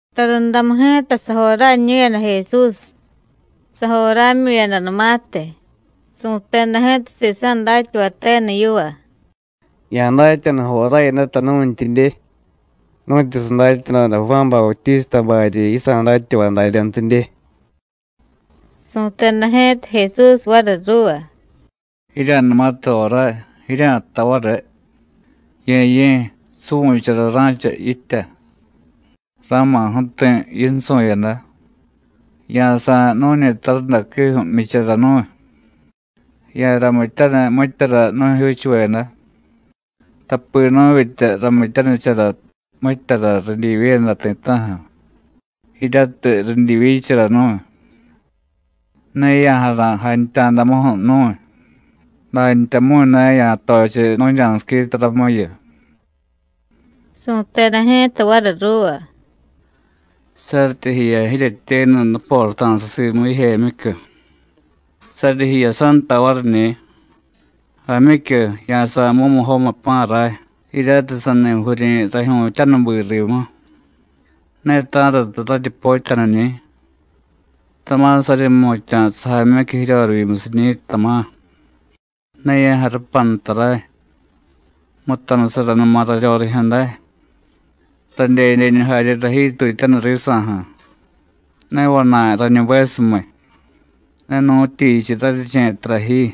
Tarundamu ji̱ta sajoráñu̱yada Jesús. Sajorámyu̱yadanumatiy, su̱teda ji̱ta sisa̱ datyavay tenu yiva: “Ya̱datyanu joráyadata nu̱ntyidye, nu̱tyu sadatyadoda Juán Bautístabaryi yisa̱ datyavay daryantidye.” Su̱teda ji̱ta Jesús variy ruuva: “Jirya̱numatiy joráy, jirya̱jtay variy: Ye̱ye̱, suvu̱chara ra̱cha yitya. Ra̱ma̱ ju̱ti̱ yinsu̱yada. Ya̱sa̱y nu̱ñi tarundaquiju̱ jmyichara nu̱y. Ya̱ramityaniy mityara nu̱jyuuchuveda, tapi nu̱vyitya ramityanichara mityara ridyivyiyada ti̱ta̱ju̱, jiryatiy ridyivyichara nu̱y. Ne ya̱jara̱y jantya̱damuju̱ nu̱y, dantyamu̱y ne ya̱tochiy nu̱ña̱siquita ramuyu.” Su̱teda ji̱ta variy ruuva: “Saryityi jiya jiryetyenu nuporata̱sa simu jijemyicyu, saryi jiyasanta variñi̱: Jaamyicyu, ya̱sa̱y mumujomiy pa̱ ray jiryatiy sani jviryi̱ rajyu̱tyánubi rimu, ne ta̱rata raryi potyaniñi̱. Tama̱ saryi jmutya̱ sajaamyicyu jiryorivyimusiñi̱, tama̱: Ne ya̱jarupanta ray. Mutanusaranuma raryorijyu̱day, radyedyeñu jarye rajyiitutyaniy risa̱ju̱. Ne vana̱y rañubesumiy, ne nu̱tyichiy raryiche̱ tara ji.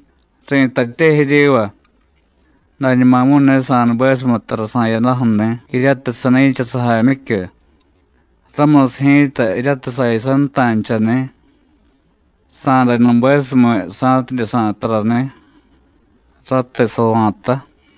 Ri̱tatye jiryiva, dañumamu̱y ne sa̱nubesumiy tara sa̱yadaju̱ni̱ jiryatiy sani̱cha sajaamyicyu, ramusiy ji̱ta, jiryatiy sayasanta̱nchani̱, sa̱day nubesumiy sa̱tidye sa̱y tarani̱, ratiy sava̱ta.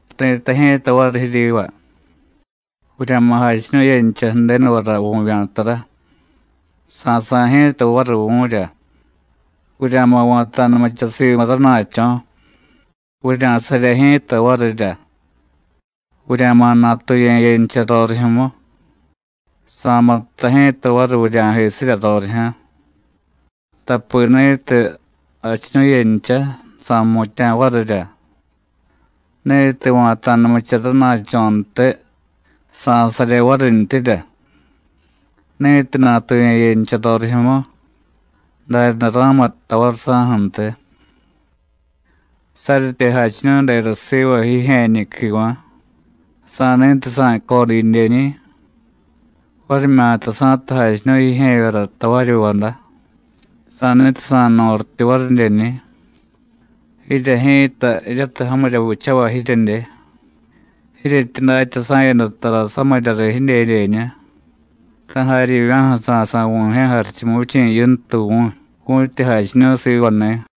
Ri̱tay ji̱ta variy jiryiva: Vurya̱ma̱ jachiñu̱yencha Ju̱denuvara vu̱vya̱tara, sa̱sa̱y ji̱ta variy vu̱rya; vurya̱ma̱ va̱ta̱numucha Simu rana̱cho̱, vurya̱sarye ji̱ta varirya; vurya̱ma̱ natuye̱yencha rorijyu̱mu, Sa̱muttay ji̱ta variy vurya̱jisirya rorijyu̱. Tapi ni̱tiy jachiñu̱yencha, sa̱jmutya̱ varirya; ni̱tiy va̱ta̱numucha rana̱cho̱ntiy, sa̱sarye varintyirya; ni̱tiy natuye̱yencha rorijyu̱mu, daryaday ra̱muttay variy saju̱ntiy. ¡Saryityi jachiñu̱y dera siva jijye̱ñi̱ quiva̱, sa̱ni̱tiy sa̱y codyidyeñi̱! Varimyata sa̱tiy jachiñu̱y jijye̱vyara tavaryi jvada, ¡sa̱ni̱tiy sa̱y norityu varidyeñi̱! Jirye ji̱ta, jiryatiy jamirya vichavay jiryedye, jiryetyi datya sa̱yada tara samirya riy jidyedyeñu, ta̱ jaryivya̱ju̱ sa̱sa̱y Vu̱jye̱ Jarichumuvichi̱ Yintu vu̱y, vu̱tyi jachiñu̱y sivani̱.”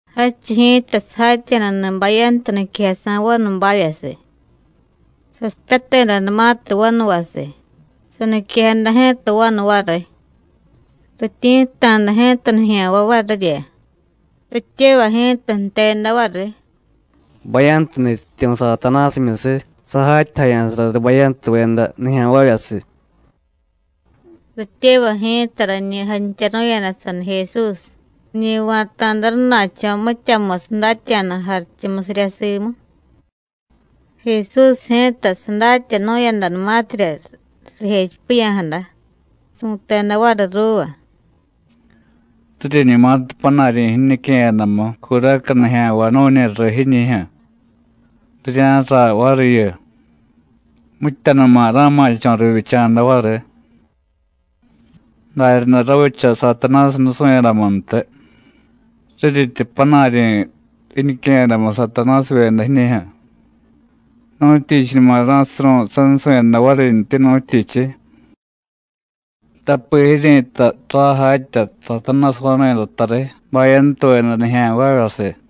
Jadchiy ji̱ta sajatya̱dani̱ bayantu niquejasa̱ vanubavyasiy. Sasipyatedanumatiy vanuvasiy, saniquejada ji̱ta vanu variy. Rityi̱tta̱da ji̱ta nijya̱nvay varirya. Rityevay ji̱ta jteda variy: “Bayantu nutyityu̱ Satanásimyusiy sajatyajaya̱sara riy bayantuveda nijya̱nvavyasiy.” Rityevay ji̱ta rañi jantyaru̱yada saniy Jesús, riñi va̱ta̱da rana̱cho̱ mityamusiy datya̱da jarichumusirya simu. Jesús ji̱ta sadatyanu̱yadanumatirya rijechipiya̱jada, su̱teda variy ruuva: “Riryiñumatiy panaryi̱ jiñique̱yadamu curaca nijya̱nvay nu̱ñi riy jiñi̱jyu̱, rirya̱jraay variyu, mityanuma ra̱ma̱cho̱ rivyicha̱da variy. Daryaday ravicha Satanásiy nusu̱yadamuntiy; riryityi panaryi̱ jiñique̱yadamu Satanásivyeda jiñi̱jyu̱, ¿nu̱tyichiñuma ra̱suru̱y sansu̱yada varintyi, nu̱tyichiy? tapi jiryi̱tay ray jatya Satanásiy vanu̱yadata riy bayantuveda nijya̱nvavyasiy.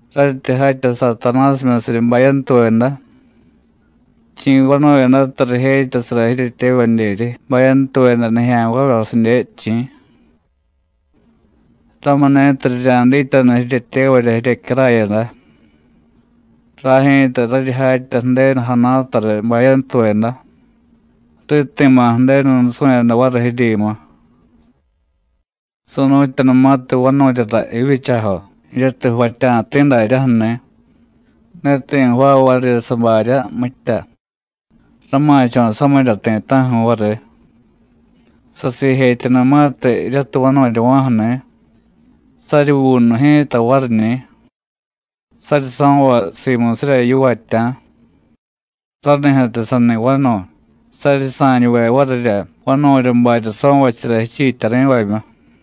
Raryityi jatya Satanásimyusiryi bayantuveda, ¿chi̱ vanu̱yadata rijetyasara jiryetyevadyeryi bayantuveda nijya̱nvavyasidye, chi̱? Ramuni̱tiy rirya̱dityanu jiryetyevarya jiryecyarayada. Ray ji̱ta raryi jatya Ju̱denu jana̱ta riy bayantuveda, riti̱ma̱ Ju̱denu nusu̱yada variy jiryimu. Su̱nu̱tyanumatiy vanu̱ryara jivyichajo, jiryatiy jvatya̱ti̱ daryaju̱ni̱, ne ti̱ jvaay varirya sabarya mitya, rama̱cho̱ samirya ti̱ta̱ju̱ variy. Sasiijetyanumatiy jiryatiy vanu̱ryava̱ju̱ni̱, saryi vuunu ji̱ta variñi̱, saryi so̱vay simusirya yivatya̱, ranijyu̱tiy sani vanu̱y, saryi sa̱ñuve varirya vanu̱rya barya so̱vachara jichiityari̱vamyu.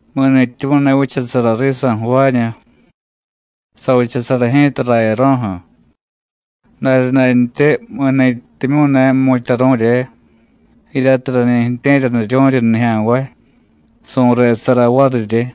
Mi̱ni̱tyimyu̱ ne vichasara risa̱ jvaañu, savichasara ji̱ta rayaro̱ju̱; daryadantyi mi̱nintyimyu̱ ne jmu̱tyaru̱rye, jiryatiy rañi ju̱tye̱ryaniryu̱ryi nijya̱nvay, su̱resara variryi.”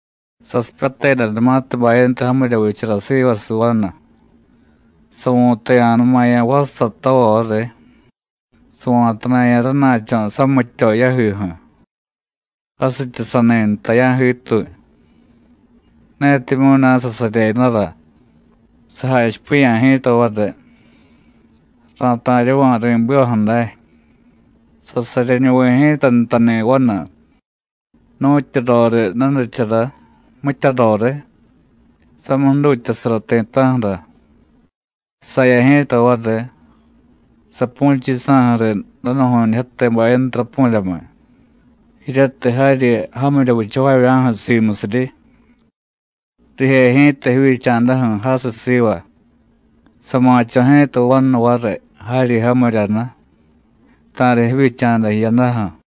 “Sasipyatedanumatiy bayantu jamirya vichara sivasiy vanu, savu̱taya̱numaya̱ vassatova variy, sava̱tana̱ya̱ rana̱cho̱ samityo yajiju̱, jasityi sani nta ya̱jiituy. Netimyu̱ ne sasaryedara, sajachipiya̱ ji̱ta variy: Ra̱ta̱ryava̱ ri̱bivaju̱ day. Sasaryenuvi̱ ji̱ta ntani̱ vanu, nu̱tyu roriy nunichara, mitya roriy, samiy jdutyasara ti̱ta̱ju̱ra. Saya ji̱ta variy, sapu̱chiy yisa̱ju̱ riy danu̱ju̱ñijyate bayantu rapu̱ryamiy, jiryatiy jaryi jamirya vichavavya̱ju̱ simusiryi. Rije ji̱ta jivyicha̱daju̱ jasiy siva. Sa̱ma̱cho̱ ji̱ta vanu variy jaryi jamiryanu, ta̱riy jivyicha̱da jiyadaju̱.”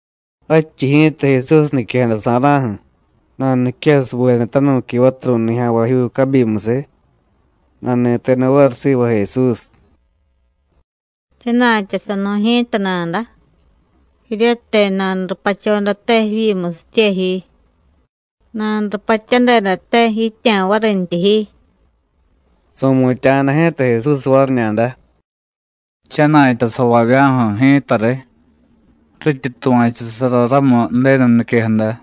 Jadchiy ji̱ta Jesús niquejadasa̱ra̱ju̱, nanuniquejasubeda tanu̱qui vaturu̱y nijya̱nvajyuu cabyimusiy, nani̱teda variy siva Jesús: “Jchana̱tyasanu̱y ji̱ta nada, jiryatiy nanurupachodate jivyimusitye ji, nanurupatyadedate jí̱tya̱ varintyi ji.” Su̱mutya̱jada ji̱ta Jesús variñada: “Jchana̱tyasavavya̱ju̱ ji̱ta riy, rityi tuva̱chusara ramu Ju̱denu niquejada.”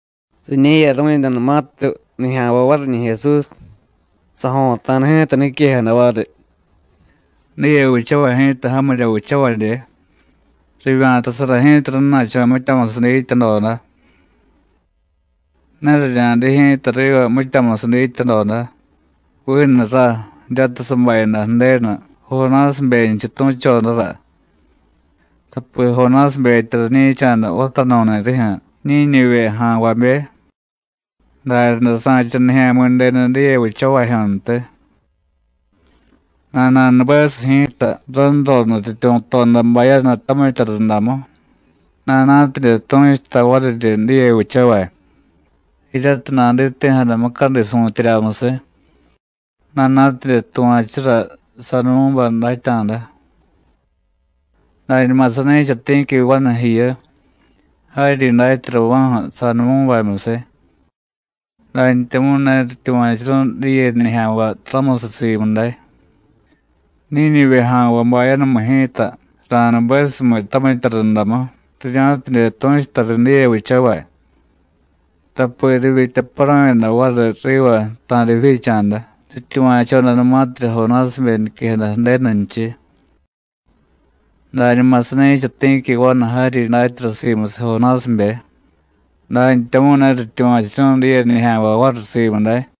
Riñe̱yaru̱yadanumatiy nijya̱nvay variñi̱ Jesús, sajo̱ta̱da ji̱ta niquejada variy: “Diye vichavay ji̱ta jamirya vichavadye. Rivya̱tasara ji̱ta rana̱cho̱ mityamusiy dityadoda. Ne rirya̱diy ji̱ta riva mityamusiy dityadoda, vinu rá jiryatiy sabayada Ju̱denu Jonásibenchiy tu̱chodara. Tapi Jonásibetya rañi̱cha̱da vatanu̱ni̱ rijyu̱ Ñíñivye ja̱nvabe, daryaday sa̱cha Nijya̱mi̱denu diye vichavajyu̱ntiy. Nana̱nubesiy ji̱ta ranro nutyityu̱toda bayanu tamitya rundamu, nana̱tidye tu̱chuta variryi diye vichavay, jiryatiy naditi̱jada mucadi su̱tyeryamusiy, nana̱tidye tuva̱chura Sadumú̱bay datya̱da. Dañuma sani̱cha ti̱qui vanu jiyu, jaryi datyarava̱ju̱ Sadumú̱bamyusiy, dantyamu̱y ne rityuva̱churu̱y diye nijya̱nvay ramusiy simu day. Ñíñivye ja̱nvay bayanumiy ji̱ta ra̱nubesumiy tamitya rundamu, rirya̱tidye tu̱chuta riy diye vichavay, tapi rivyitya paru̱yada variy riva ta̱riy jivyicha̱da, rityuva̱chodanumatirya Jonásibe niquejada Ju̱denunchiy. Dañuma sani̱cha ti̱qui vanu jaryi datyara simusiy Jonásibe, dantyamu̱y ne rityuva̱churu̱y diye nijya̱nvay variy simu day.”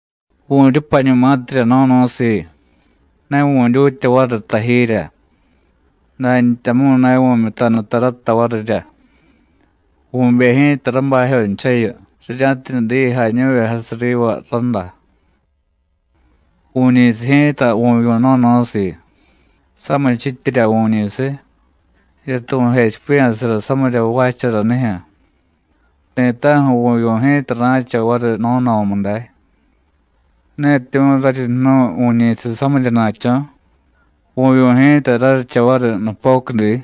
“Vu̱ryupañumatirya no̱no̱siiy, ne vu̱dyutya variy tajirya, dantyamu̱y ne vu̱myutanu tarata varirya. Vu̱bey ji̱ta rabajyonchayu, rirya̱tidye diy jañu̱vye jasiy riva rádá. Vu̱ñi̱siy ji̱ta vu̱vyu̱ no̱no̱siiy; samichityirya vu̱ñi̱siy, jiryatiy vu̱jechipiya̱sara samirya jvaacharanijyu̱, ti̱ta̱ju̱ vu̱vyu̱ ji̱ta ra̱cha variy no̱no̱mu day; netimyu̱ raryi jnu̱y vu̱ñi̱siy samiryana̱cho̱, vu̱vyu̱ ji̱ta raryicha variy nupocudi.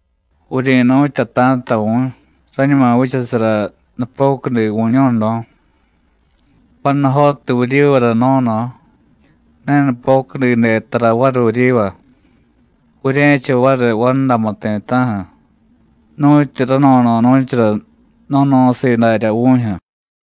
Vuryi̱nu̱tyata̱ta vu̱y, rañuma vichasara nupocudi vu̱ño̱no̱. Panujotiy vuryivara no̱no̱, ne nupocudide tara variy vuryiva, vurye̱cha variy vandamu ti̱ta̱ju̱, nu̱tyu rano̱no̱nu̱chara no̱no̱siiy daryá vu̱jyu̱.”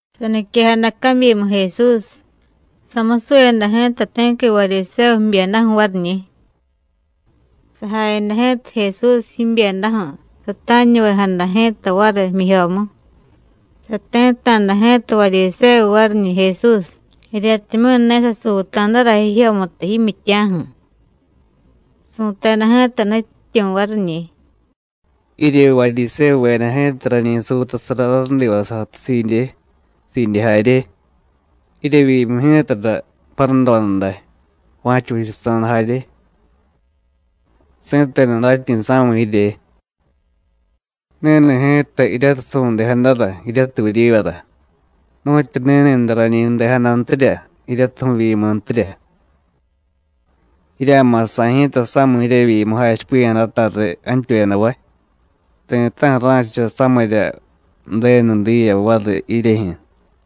Saniquejada cabyimu Jesús, samusuyada ji̱ta ti̱qui Varyisévu jbyedaju̱ variñi̱. Sajayada ji̱ta Jesús jibyedaju̱, sata̱ñuvejada ji̱ta variy jmyijyomu. Sati̱tta̱da ji̱ta Varyisévu variñi̱ Jesús, jiryatimyu̱ ne sasuuta̱dara jijyomutu jimyitya̱ju̱. Su̱teda ji̱ta Nutyityu̱ variñi̱: “Jirye Varyisévuveda ji̱ta rañi suutasara rarudivasiy jatusiidye, siidye jarye, jiryevyimu ji̱tara paradoda day, va̱cha vichasa̱da jarye. ¡Si̱tenu datyi̱sa̱miy jirye! Ni̱ni̱ ji̱ta jiryatiy su̱ndejadara jiryatiy vuryivara, nu̱tyu ni̱ni̱day rañi ju̱dejadantirya jiryatiy vu̱vyimuntirya. Jirya̱ma̱ sa̱y ji̱ta samiy jiryevyimu jachipiya̱jadata riy jantyuyadavay, ti̱ta̱ju̱ ra̱cha samirya Ju̱denu diya variy jiryejyu̱.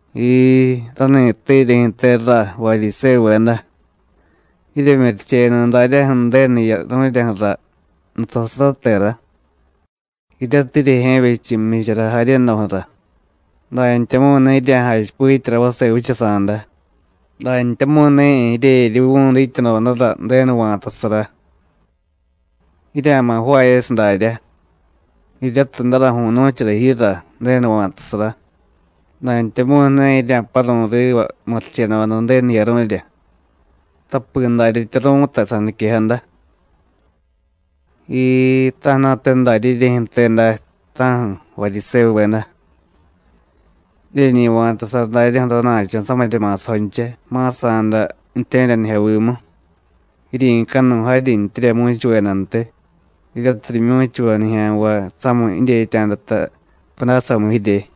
Jiii, ráni̱tte jiryejyu̱te, rá, Varyisévuveda. Jiryemyurichenu daryaju̱ Ju̱denu jiyaru̱ryaju̱ra nutasaratera, jiryatiy jiryejye̱vyechu jmyichara jaryedoju̱ra, dantyamu̱y ne jirya̱jachipityara vase vichasa̱da, dantyamu̱y ne jiryejeryuvu̱y dityadodara Ju̱denu va̱tasara. Jirya̱ma̱ jvaayasiy daryá, jiryatiy daraju̱y nu̱chara jiyura Ju̱denu va̱tasara, dantyamu̱y ne jirya̱paru̱y riva murichedoda Ju̱denu jiyaru̱rya, tapi daryatya ru̱tay saniquejada. ¡Jiii, ta̱ju̱na̱te darya jiryejyu̱te day, ta̱ju̱, Varyisévuveda! Jiryeñi va̱tasara daryaju̱ rana̱cho̱ samirya ma̱sajoncha ma̱sa̱da ju̱tye̱ryanijyovimu, jiryi̱canuy jaryintyirya mu̱chuvedantiy jiryatiy rimyu̱chuvay nijya̱nvay samiy jidyetya̱data pudásamu jirye.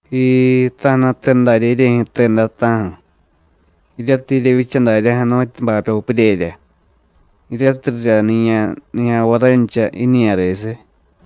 Jiii, ta̱ju̱na̱te darya jiryejyu̱te day, ta̱ju̱, jiryatiy jiryevyicha daryaju̱ nu̱tyu bapyo puryerya, jiryatiy riryaniya̱ nijya̱nvay rancha jiñiya̱resiy.”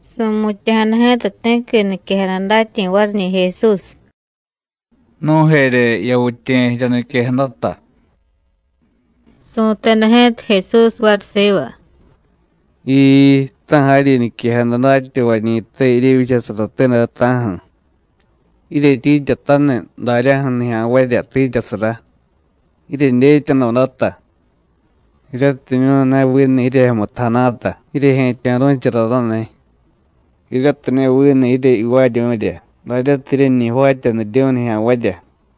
Su̱mutya̱jada ji̱ta ti̱qui niquejada datyi̱ variñi̱ Jesús: “Nu̱jerye yavityiye̱ jirya niquejadata.” Su̱teda ji̱ta Jesús variy siva: “¡Jiii, ta̱ jaryi niquejada datyavañi̱te jiryevyichasarate day, ta̱ju̱! Jiryetyiityataniy daryaju̱ nijya̱nvarya tiityasara, jiryedyetyadodata, jiryatimyu̱ ne vinu jiryejyomutu jana̱ta jiryejye̱tyo̱ru̱chara raniy, jiryatiy ne vinu jiryivaaryu̱rya daryatiy jiryeñi jvaatyaniryu̱y nijya̱nvarya.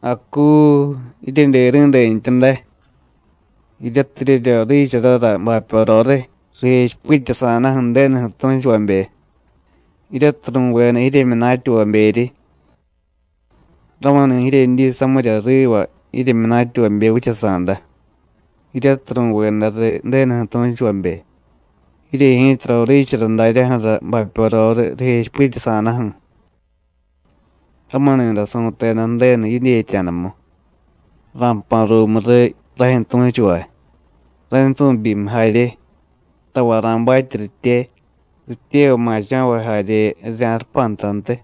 ¡Acuu jiryedyeri̱dentya day! jiryatiy jiryeryoriicharara bapyo roriy rijechipityasa̱daju̱ Ju̱denuju̱ tu̱chuvabe, jiryatiy ru̱veda jiryemyunatyavaberyi. Ramuni̱ jiryedyi samirya riva jimyunatyavabe vichasa̱da, jiryatiy ru̱veda riy Ju̱denuju̱ tu̱chuvabe, jirye ji̱ta roriichara daryaju̱ra bapyo roriy rijechipityasa̱daju̱. Ramuni̱day su̱teda Ju̱denu jidyetya̱damu: Ra̱jpa̱ ruumu riy rajyu̱ tu̱chuvay, raynsu̱byimiy jarye, tavay ra̱batye ritye, rityevay ma̱cho̱vay jarye rirya̱jarupantantiy,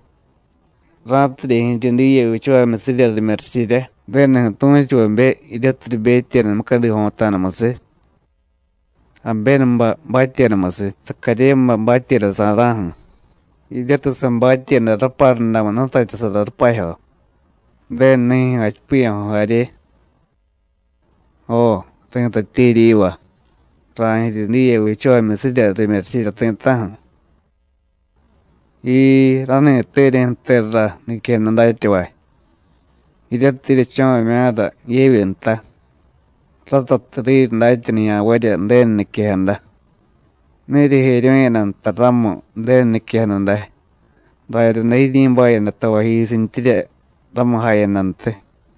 ra̱tidye jiryi diye vichavamyusirya rimyurichirya Ju̱denuju̱ tu̱chuvabe, jiryatiy ribetyeda mucadi jo̱ta̱damusiy, Abénubay batyedamusiy, Sacaryébay batyedasa̱ra̱ju̱, jiryatiy sabatyeda raparudamu jnutatyasara rupajyo, Ju̱denu nijyu̱ jachipiya̱jo jarye. Jo, ri̱tatye jiryiva: Ra̱jiryi diye vichavamyusirya rimyurichirya ti̱ta̱ju̱. Jiii, ráni̱tte jiryejyu̱te rá, niquejada datyavay, jiryatiy jiryecho̱vamya̱ra yevyi nta, ratatiy riryi datya nijya̱nvarya Ju̱denu niquejada. Ne jiryejeryu̱yada nta ramu Ju̱denu niquejada day, daryaday jiryi̱bayada tavayjisintyirya ramu jayadantiy.”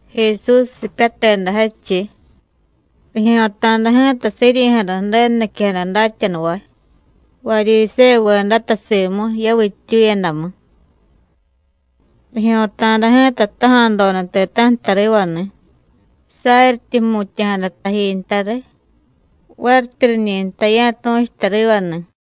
Jesús sipyateda jadchiy, rijyo̱ta̱da ji̱ta siryi̱jada Ju̱denu niquejada datyanuvay, Varyisévuvedata simu yavittyuyadamu. Rijyo̱ta̱da ji̱ta jtaja̱doda ti̱ta̱ju̱ tarivani̱, saryityi jmutya̱jada taji nta riy, varityi riñi jtay ya̱tu̱chuta rivani̱.